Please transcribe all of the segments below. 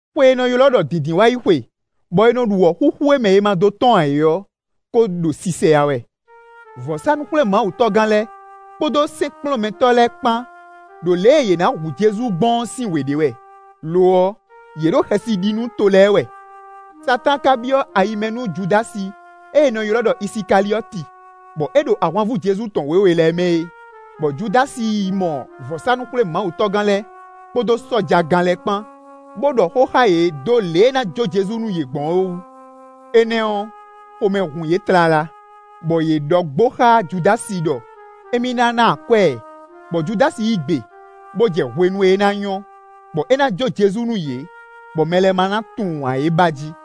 Xwe e è nɔ ylɔ́ ɖɔ Dǐndínwáyixwe, bɔ è nɔ ɖu wɔ̌xúxú e mɛ è ma dó tɔ́n ǎ é ɔ́ kó ɖo sisɛyá wɛ. Vɔ̌sánú-xwlémawutɔ́gán lɛ́ɛ, kpódó sɛ́nkplɔ́nmɛtɔ́ lɛ́ɛ kpán ɖo lě e yě ná hu Jezu gbɔn ɔ́ sín wě ɖe wɛ; lo ɔ́, yě ɖo xɛsi ɖi nú to lɛ́ɛ wɛ. Satáan ka byɔ́ ayi mɛ nú Judási e è nɔ ylɔ́ ɖɔ Isikaliɔ́ti, bɔ é ɖo ahwanvú Jezu tɔn wěwe lɛ́ɛ mɛ é; bɔ Judási yi mɔ vɔ̌sánú-xwlémawutɔ́gán lɛ́ɛ kpódó sɔ́jagán lɛ́ɛ kpán, bó ɖɔ xó xá yě dó lě e é ná jó Jezu nú yě gbɔn ɔ́ wú. Énɛ́ ɔ́, xomɛ hun yě tlala, bɔ yě ɖɔ gbo xá Judási ɖɔ émí ná ná akwɛ́ ɛ, bɔ Judási yí gbe, bó jɛ hwenu e ná nyɔ́, bɔ é ná jó Jezu nú yě, bɔ mɛ lɛ́ɛ ma ná tunwun ǎ é ba jí.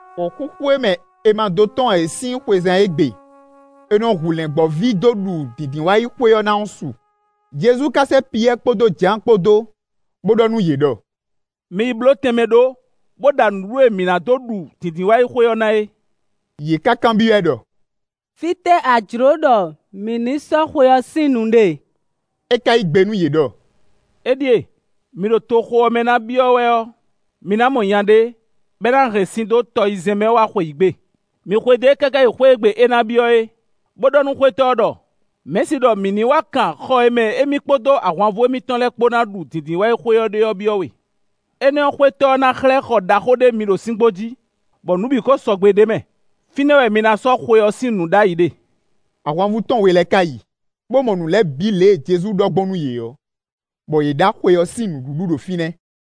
Wɔ̌xúxú e mɛ è ma dó tɔ́n ǎ é sín xwezán e gbe è nɔ hu lɛ̌ngbɔ́ví dó ɖu Dǐndínwáyixwe ɔ́ ná ɔ́ su. Jezu ka sɛ́ Piyɛ́ɛ kpódó Jǎan kpó dó, bó ɖɔ nú yě ɖɔ: “Mi yi bló tɛnmɛ ɖó, bó ɖa nǔɖuɖu e mǐ nǎ dó ɖu Dǐndínwáyixwe ɔ́ ná é.” Yě ká kanbyɔ́ ɛ ɖɔ: “Fítɛ́ a jlǒ ɖɔ mǐ ní yi sɔ́ xwe ɔ́ sín nǔ ɖe?” É ka yí gbe nú yě ɖɔ: “Éɖíe: mi ɖo toxo ɔ́ mɛ ná byɔ́ wɛ ɔ́, mi ná mɔ nya ɖé, bɔ é ná hɛn sin dó tɔyizɛ́n mɛ wá xweyǐgbe; mi xwedó e káká yi xwé e gbe é ná byɔ́ é, bó ɖɔ nú xwétɔ́ ɔ́ ɖɔ: ‘Mɛ̌si ɖɔ mǐ ní wá kan xɔ e mɛ émí kpódó ahwanvú émítɔn lɛ́ɛ kpó ná ɖu Dǐndínwáyixwe ɔ́ ɖe ɔ́ byɔ́ we.’ Énɛ́ ɔ́, xwétɔ́ ɔ́ ná xlɛ́ xɔ ɖaxó ɖé mi ɖo síngbó jí, bɔ nǔ bǐ ko sɔgbe ɖ'é mɛ; fínɛ́ wɛ mi ná sɔ́ xwe ɔ́ sín nǔ ɖ'ayǐ ɖe.” Ahwanvú tɔn we lɛ́ɛ ka yi, bó mɔ nǔ lɛ́ɛ bǐ lě e Jezu ɖɔ gbɔn nú yě ɔ́, bɔ yě ɖa xwe ɔ́ sín nǔɖuɖu ɖo fínɛ́.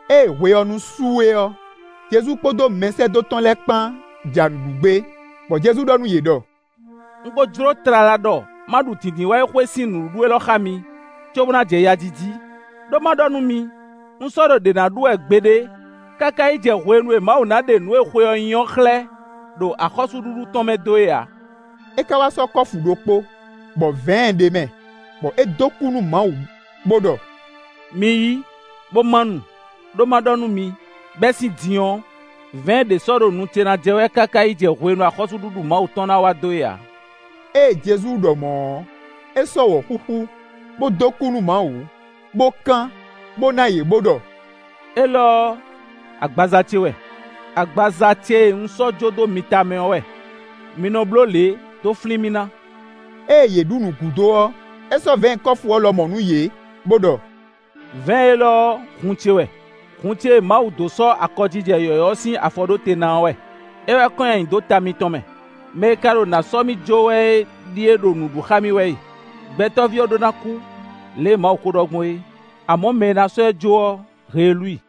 Ée hwe ɔ́ nu su é ɔ́, Jezu kpódó mɛsɛ́dó tɔn lɛ́ɛ kpán ja nǔ ɖu gbé, bɔ Jezu ɖɔ nú yě ɖɔ: “Un ko jló tlala ɖɔ ma ɖu Dǐndínwáyixwe sín nǔɖuɖu élɔ́ xá mi, cóbó ná jɛ ya ji jí; ɖó ma ɖɔ nú mi: un sɔ́ ɖo ɖě ná ɖu wɛ gbeɖé, káká yi jɛ hwenu e Mawu ná ɖe nǔ e xwe ɔ́ nyí ɔ́ xlɛ́, ɖo axɔ́súɖuɖu tɔn mɛ dó é ǎ.” É ká wá sɔ́ kɔ́fu ɖokpó, bɔ vɛ̌ɛn ɖ'é mɛ, bɔ é dó kú nú Mawu, bó ɖɔ: “Mi yí, bó má nu, ɖó má ɖɔ nú mi, bɛ́ sín din ɔ́, vɛ̌ɛn ɖě sɔ́ ɖo nu ce ná jɛ wɛ káká yi jɛ hwenu e axɔ́súɖuɖu Mawu tɔn ná wá dó é ǎ.” Ée Jezu ɖɔ mɔ̌ ɔ́, é sɔ́ wɔ̌xúxú, bó dó kú nú Mawu, bó kán, bó ná yě bó ɖɔ: “Élɔ́ ɔ́, agbaza ce wɛ; [agbaza ce e un sɔ́ jó dó mi ta mɛ ɔ́ wɛ; mi nɔ bló lě, dó flín mì ná.” Ée yě ɖu nǔ gúdo ɔ́, é sɔ́ vɛ̌ɛn kɔ́fu ɔ́ lɔmɔ̌ nú yě, bó ɖɔ: “Vɛ̌ɛn élɔ́ ɔ́, hun ce wɛ; hun ce e Mawu dó sɔ́ akɔjijɛ yɔ̌yɔ́ ɔ́ sín afɔ ɖó te ná ɔ́ wɛ; é wɛ kɔn nyi ayǐ dó ta mitɔn mɛ.] “Mɛ e ka ɖo nǎ sɔ́ mì jó wɛ é ɖíe ɖo nǔ ɖu xá mì wɛ e. Gbɛtɔ́ví ɔ́ ɖó ná kú, lě e Mawu kó ɖɔ gbɔn é, amɔ̌ mɛ e ná sɔ́ ɛ jó ɔ́, heelú i.”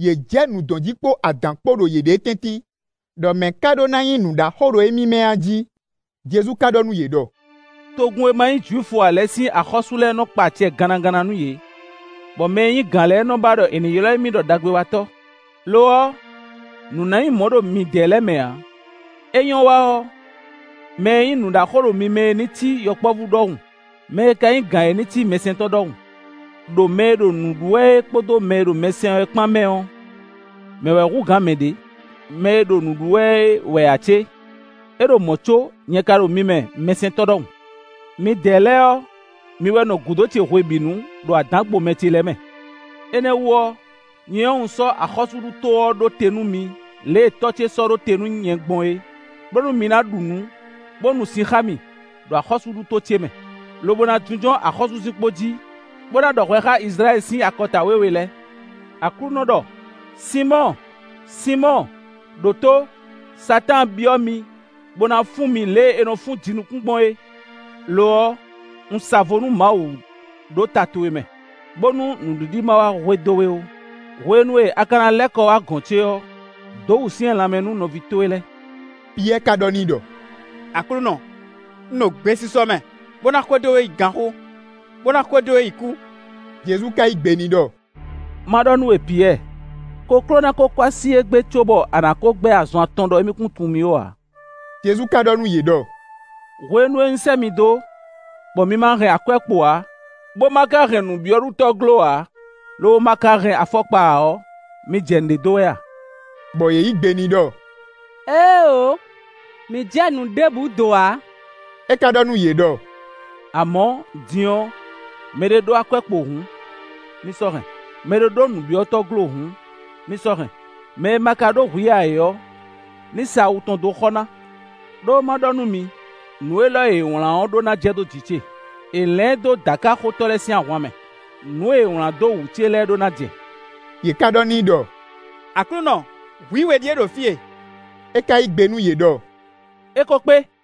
Yě jɛ nǔ dɔn jí kpó adǎn kpó ɖo yěɖée tɛ́ntin, ɖɔ mɛ̌ ká ɖó ná nyí nǔɖaxó ɖo émí mɛ a jí. Jezu ka ɖɔ nú yě ɖɔ: “Togun e ma nyí Jwifu ǎ lɛ́ɛ sín axɔ́sú lɛ́ɛ nɔ́ kpa acɛ gannaganna nú yě, bɔ mɛ e nyí gǎn lɛ́ɛ nɔ́ ba ɖɔ è nǐ ylɔ́ émí ɖɔ ‘Đagbewatɔ́.’ Lo ɔ́, nǔ ná nyí mɔ̌ ɖo midɛɛ lɛ́ɛ mɛ ǎ; é nyɔ́ wa ɔ́, mɛ e nyí nǔɖaxó ɖo mi mɛ é ní cí yɔkpɔ́vú ɖɔhun; mɛ e ka nyí gǎn é ní cí mɛsɛntɔ́ ɖɔhun. Đo mɛ e ɖo nǔ ɖu wɛ é kpódó mɛ e ɖo mɛ sɛn wɛ ɔ́ kpán mɛ ɔ́, mɛ̌ wɛ hú gǎn mɛ ɖě? Mɛ e ɖo nǔ ɖu wɛ é wɛ ǎ cé? É ɖo mɔ̌ có, nyɛ ka ɖo mi mɛ mɛsɛntɔ́ ɖɔhun. “Midɛɛ lɛ́ɛ ɔ́, mi wɛ nɔ gúdo ce hwebǐnu, ɖo adǎngbomɛ ce lɛ́ɛ mɛ. Énɛ́ wú ɔ́, nyɛ ɔ́, un sɔ́ axɔ́súɖuto ɔ́ ɖó te nú mi, lě e Tɔ́ ce sɔ́ ɖó te nú nyɛ gbɔn é, bónú mi na ɖu nǔ, bó nu sin xá mì, ɖo axɔ́súɖuto ce mɛ, lobo na jínjɔ́n axɔ́súzinkpo jí, bó na ɖɔ hwɛ xá Izlayɛ́li sín akɔta wěwe lɛ́ɛ.” “Aklúnɔ ɖɔ: Sinmɔ́ɔ! Sinmɔ́ɔ! Đǒtó; Satáan byɔ́ mi, bó na fún mi lě e è nɔ fún jinukún gbɔn é. Lo ɔ́, un sa vo nú Mawu ɖó ta towe mɛ, bónú nǔɖiɖi má wá hwe dó we ó. Hwenu e a ka ná lɛ́ kɔ wá gɔ̌n ce ɔ́, dǒ wǔsyɛ́n lanmɛ nú nɔví towe lɛ́ɛ.” Piyɛ́ɛ ka ɖɔ n'i ɖɔ: “Aklúnɔ! Un ɖo gbesisɔ mɛ, bó ná xwedó we yi ganxó, bó ná xwedó we yi kú.” Jezu ka yí gbe n'i ɖɔ: “Má ɖɔ nú we Piyɛ́ɛ! Kokló ná kó kɔ́ así égbé cóbɔ a nǎ kó gbɛ́ azɔn atɔn ɖɔ émí kún tunwun mì ó ǎ.” Jezu ka ɖɔ nú yě ɖɔ: “Hwenu e un sɛ́ mi dó, bɔ mi ma hɛn akwɛ́kpo ǎ, bó ma ka hɛn nǔbyɔ́ɖutɔ́glo ǎ, lobo ma ka hɛn afɔkpa ǎ ɔ́, mi jɛ nǔɖé dó wɛ a?” Bɔ yě yí gbe n'i ɖɔ: “Éeǒ, mǐ jɛ nǔ ɖěbǔ do ǎ.” É ka ɖɔ nú yě ɖɔ: “Amɔ̌, din ɔ́, mɛɖé ɖó akwɛ́kpo hǔn, ní sɔ́ hɛn; mɛɖé ɖó nǔbyɔ́ɖutɔ́glo hǔn, ní sɔ́ hɛn; mɛ e ma ka ɖó hwǐ ǎ é ɔ́, ní sa awu tɔn dó xɔ ná. Đó má ɖɔ nú mi: nǔ élɔ́ e è wlǎn ɔ́ ɖó ná jɛ dó jǐ ce. ‘È lɛ̌n ɛ dó dǎkaxotɔ́ lɛ́ɛ sín ahwan mɛ.’ Nǔ e è wlǎn dó wǔ ce lɛ́ɛ ɖó ná jɛ.” Yě ká ɖɔ n'i ɖɔ: “Aklúnɔ, hwǐ we ɖíe ɖo fí e.” É ka yí gbe nú yě ɖɔ: “É ko kpé.”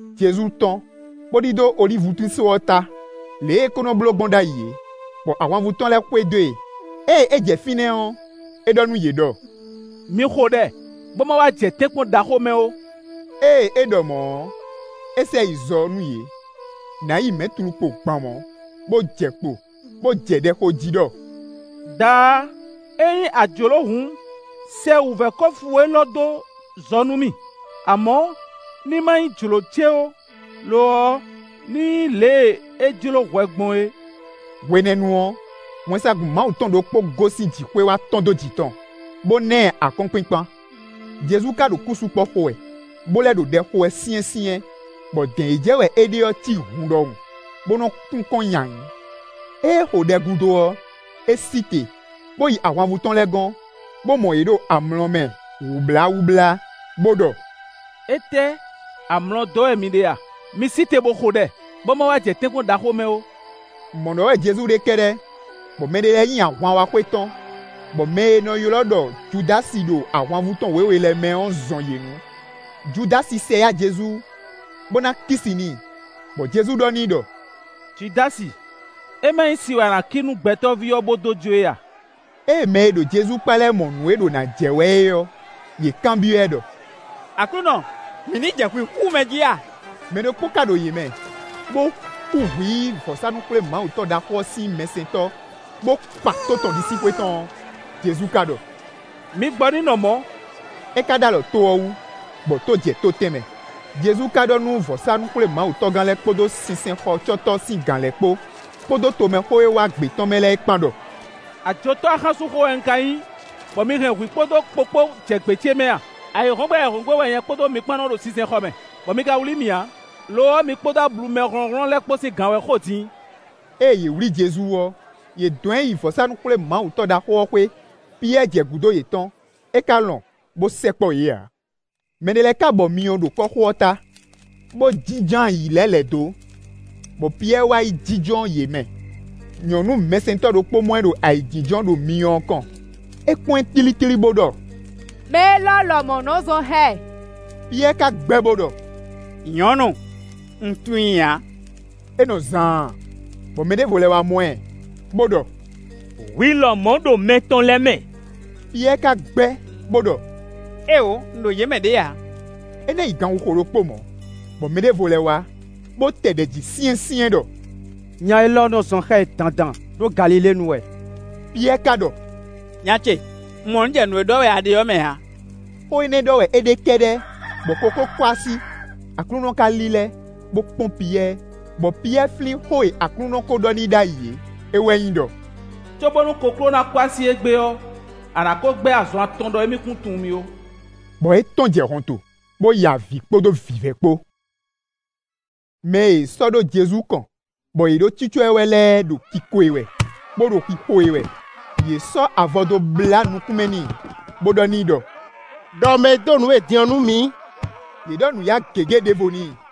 Jezu tɔ́n, bó ɖidó olívutín só ɔ́ ta, lě e é kó nɔ́ bló gbɔn ɖ'ayǐ é, bɔ ahwanvú tɔn lɛ́ɛ xwedó e. Ée é jɛ fínɛ́ ɔ́, é ɖɔ nú yě ɖɔ: “Mi xo ɖɛ, bó ma wá jɛ tɛ́nkpɔ́n ɖaxó mɛ ó.” Ée é ɖɔ mɔ̌ ɔ́, é sɛ yi zɔ nú yě, nǎ yi mɛ̌tlukpo gban mɔ̌, bó jɛ kpo, bó jɛ ɖɛ xo jí ɖɔ: “Daá! Ényí a jlǒ hǔn, sɛ wǔvɛ́ kɔ́fu élɔ́ dó zɔ nú mì; amɔ̌, ní má nyí jlǒ ce ó, lo ɔ́, ní nyí lě e é jló hwɛ gbɔn é.” [ Hwenɛ́nu ɔ́, wɛnsagun Mawu tɔn ɖokpó gosín jǐxwé wá tɔ́n dó jǐ tɔn, bó ná ɛ akɔ́nkpinkpan. Jezu ka ɖo kúsukpɔ xo wɛ, bó lɛ́ ɖo ɖɛ xo wɛ syɛ́nsyɛ́n, bɔ dɛ̌n e jɛ wɛ é ɖe ɔ́ cí hun ɖɔhun, bó nɔ kun kɔn nyi ayǐ.] Ée é xo ɖɛ gúdo ɔ́, é sí te, bó yi ahwanvú tɔn lɛ́ɛ gɔ́n, bó mɔ yě ɖo amlɔ mɛ wǔbláwúblá, bó ɖɔ: “Étɛ́! Amlɔ dɔ́ wɛ mi ɖe a? Mi sí te bó xo ɖɛ, bó má wá jɛ tɛ́nkpɔ́n ɖaxó mɛ ó.” Mɔ̌ ɖɔ wɛ Jezu ɖe kɛ́ɖɛ́, bɔ mɛɖé lɛ́ɛ nyi ahwan wá xwetɔ́n, bɔ mɛ e è nɔ ylɔ́ ɖɔ Judási ɖo ahwanvú tɔn wěwe lɛ́ɛ mɛ ɔ́ zɔn yě nu. Judási sɛ yá Jezu, bó ná kí si n'i, bɔ Jezu ɖɔ n'i ɖɔ: “Judási, é má nyí si wɛ a kí nú Gbɛtɔ́ví ɔ́ bó dó jó e a?” Ée mɛ e ɖo Jezu kpá lɛ́ɛ mɔ nǔ e ɖo nǎ jɛ wɛ é ɔ́, yě kanbyɔ́ ɛ ɖɔ: “Aklúnɔ, mǐ ní jɛ hwǐ xú mɛ jí a?” Mɛ ɖokpó ka ɖo yě mɛ, bó xú hwǐ vɔ̌sánú-xwlémawutɔ́ ɖaxó ɔ́ sín mɛsɛntɔ́, bó kpa tó tɔn ɖisíxwé tɔn ɔ́. Jezu ka ɖɔ: “Mi gbɔ; ní nɔ mɔ̌!” É ka ɖó alɔ tó ɔ́ wú, bɔ tó jɛ tó tɛnmɛ. Jezu ka ɖɔ nú vɔ̌sánú-xwlémawutɔ́gán lɛ́ɛ kpódó sinsɛnxɔcɔ́tɔ́ sín gǎn lɛ́ɛ kpó, kpódó tomɛxó e wá gbě tɔn mɛ lɛ́ɛ kpán ɖɔ: “Ajotɔ́ axánsúnxó wɛ un ka nyí, bɔ mi hɛn hwǐ kpódó kpo kpó jɛ gbě ce mɛ a? Ayǐhɔ́ngbe ayǐhɔ́ngbe wɛ nyɛ kpódó mi kpán nɔ́ ɖo sinsɛnxɔ mɛ, bɔ mi ka wlí mì ǎ; lo ɔ́, mi kpódó ablu mɛ hlɔ̌nhlɔ́n lɛ́ɛ kpó sín gan wɛ xo din.” Ée yě wlí Jezu ɔ́, yě dɔn ɛ yi vɔ̌sánú-xwlémawutɔ́ ɖaxó ɔ́ xwé. Piyɛ́ɛ jɛ gǔdo yětɔn, é ka lɔn bó sɛkpɔ́ yě ǎ. Mɛ ɖé lɛ́ɛ ka bɔ myɔ ɖo kɔ́xo ɔ́ ta, bó jínjɔ́n ayǐ lɛ́ lɛ̌ dó, bɔ Piyɛ́ɛ wá yi jínjɔ́n yě mɛ. Nyɔ̌nu mɛsɛntɔ́ ɖokpó mɔ ɛ ɖo ayǐjínjɔ́n ɖo myɔ ɔ́ kɔn; é kpɔ́n ɛ tlítlí, bó ɖɔ: “Mɛ élɔ́ lɔmɔ̌ nɔ zɔn xá ɛ!” Piyɛ́ɛ ka gbɛ́ bó ɖɔ: “Nyɔ̌nu, un tunwun i ǎ.” É nɔ zaan, bɔ mɛ ɖěvo lɛ́ wá mɔ ɛ, bó ɖɔ: “Hwi lɔmɔ̌ ɖo mɛ tɔn lɛ́ɛ mɛ!” Piyɛ́ɛ ka gbɛ́, bó ɖɔ: “Éeǒ, un ɖo yě mɛ ɖě ǎ!” É ná yi gan xixo ɖokpó mɔ̌, bɔ mɛ ɖěvo lɛ́ wá, bó tɛ ɖɛ̌ jí syɛ́nsyɛ́n ɖɔ: “Nya élɔ́ nɔ́ zɔn xá ɛ dandan, ɖó Galilée nu wɛ!” Piyɛ́ɛ ka ɖɔ: “Nya ce, un mɔ nǔ jɛ nǔ e ɖɔ wɛ a ɖe ɔ́ mɛ ǎ.” Xó énɛ́ ɖɔ wɛ é ɖe kɛ́ɖɛ́ bɔ kokló kɔ́ así. Aklúnɔ ká lílɛ́, bó kpɔ́n Piyɛ́ɛ, bɔ Piyɛ́ɛ flín xó e Aklúnɔ kó ɖɔ n'i ɖ'ayǐ é; é wɛ nyí ɖɔ: “Cóbónú kokló ná kɔ́ así égbé ɔ́, a nǎ kó gbɛ́ azɔn atɔn ɖɔ émí kún tunwun mì ó.” Bɔ é tɔ́n jɛ hɔnto, bó ya avǐ kpódó vǐvɛ́ kpó. Mɛ e è sɔ́ ɖó Jezu kɔn, bɔ yě ɖo cícɔ́ ɛ wɛ lɛ́ɛ ɖo kiko e wɛ, bó ɖo xixo e wɛ. Yě sɔ́ avɔ dó blá nukún mɛ n'i, bó ɖɔ n'i ɖɔ: “Đɔ mɛ e dó nǔ we din ɔ́ nú mǐ.” Yě ɖɔ nǔyá gěgé ɖěvo n'i.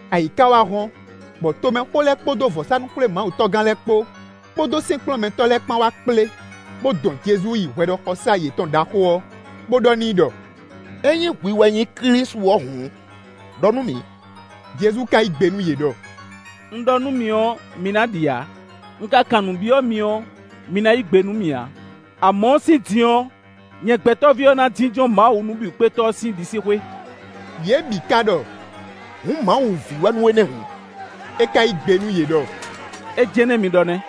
Ayǐ ká wá hɔ́n, bɔ tomɛxó lɛ́ɛ kpódó vɔ̌sánú-xwlémawutɔ́gán lɛ́ɛ kpó, kpódó sɛ́nkplɔ́nmɛtɔ́ lɛ́ɛ kpán wá kplé, bó dɔn Jezu yi hwɛɖɔxɔsá yětɔn ɖaxó ɔ́, bó ɖɔ n'i ɖɔ: “Ényí hwi wɛ nyí Klísu ɔ́ hǔn, ɖɔ nú mǐ.” Jezu ka yí gbe nú yě ɖɔ: “Un ɖɔ nú mi ɔ́, mi ná ɖi ǎ; un ka kan nǔ byɔ́ mi ɔ́, mi ná yí gbe nú mì ǎ. Amɔ̌, sín din ɔ́, nyɛ Gbɛtɔ́ví ɔ́ ná jínjɔ́n Mawu Nǔbǐwúkpétɔ́ ɔ́ sín ɖisíxwé.” Yě bǐ ka ɖɔ: “Hǔn Mawu ví wɛ nú we nɛ́ hǔn?” É ká yí gbe nú yě ɖɔ: “É jɛ́n nɛ́ mi ɖɔ nɛ́.”